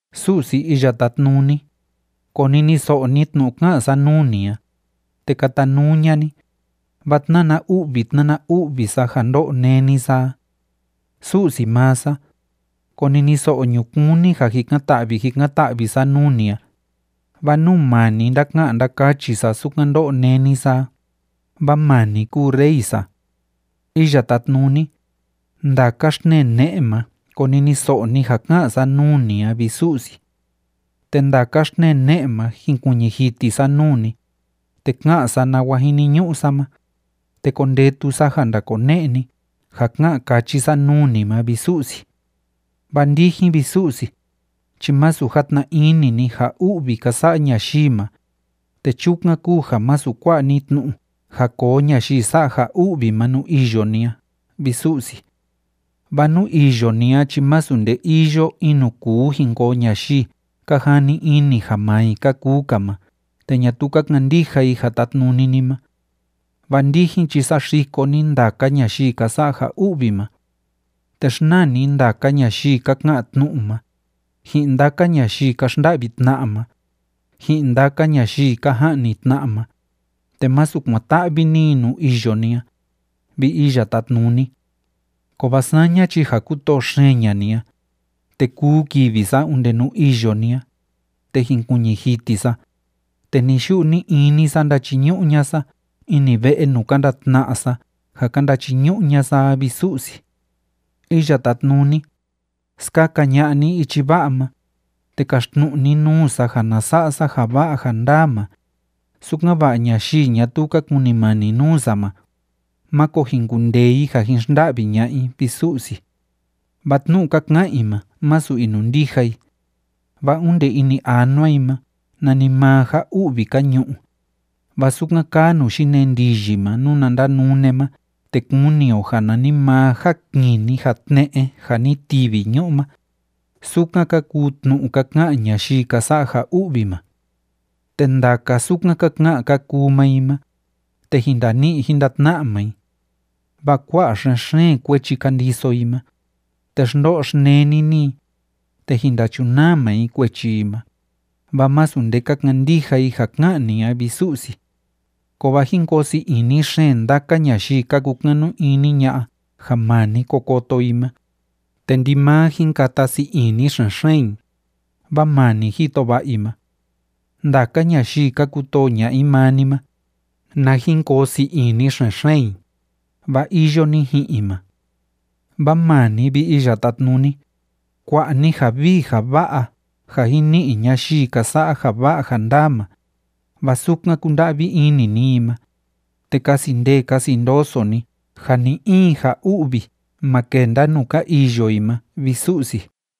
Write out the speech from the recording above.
Su'si Iya Tátnuni, koniniso'o ni tnu'u ká'an sa nuu ni a, te katanuu ña'a ni, vaa tnána u'vi tnána u'vi sa ja ndó'o néni sa a. Su'si maa sa, koniniso'o ñukuun ni ja jikan‑ta'vi jikan‑ta'vi sa nuu ni a, vaa nuu maa ni ndáka'an ndákachi sa sukan ndó'o néni sa a, vaa maa ni kúu rey sa. Iya Tátnuni, ndaka xtnee ne'e ma koniniso'o ni ja ká'an sa nuu ni a, vi Su'si. Te ndaka xtnee ne'e ma jinkuiñi jiti sa nuu ni, te ka'an sa nawa jiniñu'u sa ma, te kondetu sa ja ndakone'e ni ja ká'an káchi sa nuu ni ma, vi Su'si. Vaa ndijin, vi Su'si, chi masu játna ini ni ja u'vi ka sa'a ñayii ma, te chukan kúu ja masu kua'a ni tnu'u ja koo ñayii sa'a ja u'vi ma nuu iyo ni a, vi Su'si. Vaa nuu iyo ni a chi masu nde iyo in nuu kúu jin koo ñayii ka jani ini ja maa i ka kuu‑ka ma te ñatuu ka kandija i ja tátnuni ni ma. Vaa ndijin chi saxiko ni ndaka ñayii ka sa'a ja u'vi ma. Te xnaa ni ndaka ñayii ka ka'an tnu'u ma, ji'in ndaka ñayii ka xnda'vi tna'a ma, ji'in ndaka ñayii ka ja'ni tna'a ma, te masu kuan‑ta'vi ni i nuu iyo ni a, vi Iya Tátnuni. Kovaa saña chi ja kútoo xeen ña'a ni a, te kuu kivi sa onde nuu iyo ni a, te jinkuiñi jiti sa, te ni‑yu'u ni‑ini sa ndachiñu'u ña'a sa ini ve'e nuu ka ndatna'a sa ja ka ndachiñu'u ña'a sa a, vi Su'si. Iya Tátnuni, skaka ña'a ni ichi va'a ma, te kaxtnu'u ni nuu sa ja na sa'a sa ja va'a ja ndaa ma, sukan‑va'a ñayii ñatuu ka kunimani nuu sa ma, máko jin kundee i ja jin xnda'vi ña'a i, vi Su'si. Vaa tnu'u ka ka'an i ma, másu inundija i, vaa onde ini anua i ma nanimaa ja u'vi ka ñu'u, vaa sukan kaa nuu yinee ndiyi ma nuna ndanune ma te kuni o ja nanimaa ja kini ja tne'e ja ni tivi ñu'u ma, sukan ka kuu tnu'u ka ka'an ñayii ka sa'a ja u'vi ma. Te ndaka sukan ka ka'an ka kuu maa i ma, te jin ndani'i jin ndatna'a maa i. Vaa kua'a xen‑xeen kuechi ka ndiso i ma, te xndo'o xneni ni i, te jin ndachunaa maa i kuechi i ma, vaa masu nde ka kandija i ja ká'an ni a, vi Su'si. Kovaa jín koo sii ini xeen ndaka ñayii ka kukanu ini ña'a ja maa ni ko koto i ma, te ndimaa jín kata sii ini xen‑xeen i, vaa maa ni jito va'a i ma. Ndaka ñayii ka kutoo ña'a i maa ni ma, na jin koo sii ini xen‑xeen i, vaa iyo ni ji'in i ma. Vaa maa ni, vi Iya Tátnuni, kua'a ni ja vii ja va'a ja jin ni'i ñayii ka sa'a ja va'a ja ndaa ma, vaa sukan kúnda'vi ini ni i ma, te kasi ndee kasi ndoso ni ja ni‑in ja u'vi ma kenda nuu ka iyo i ma, vi Su'si.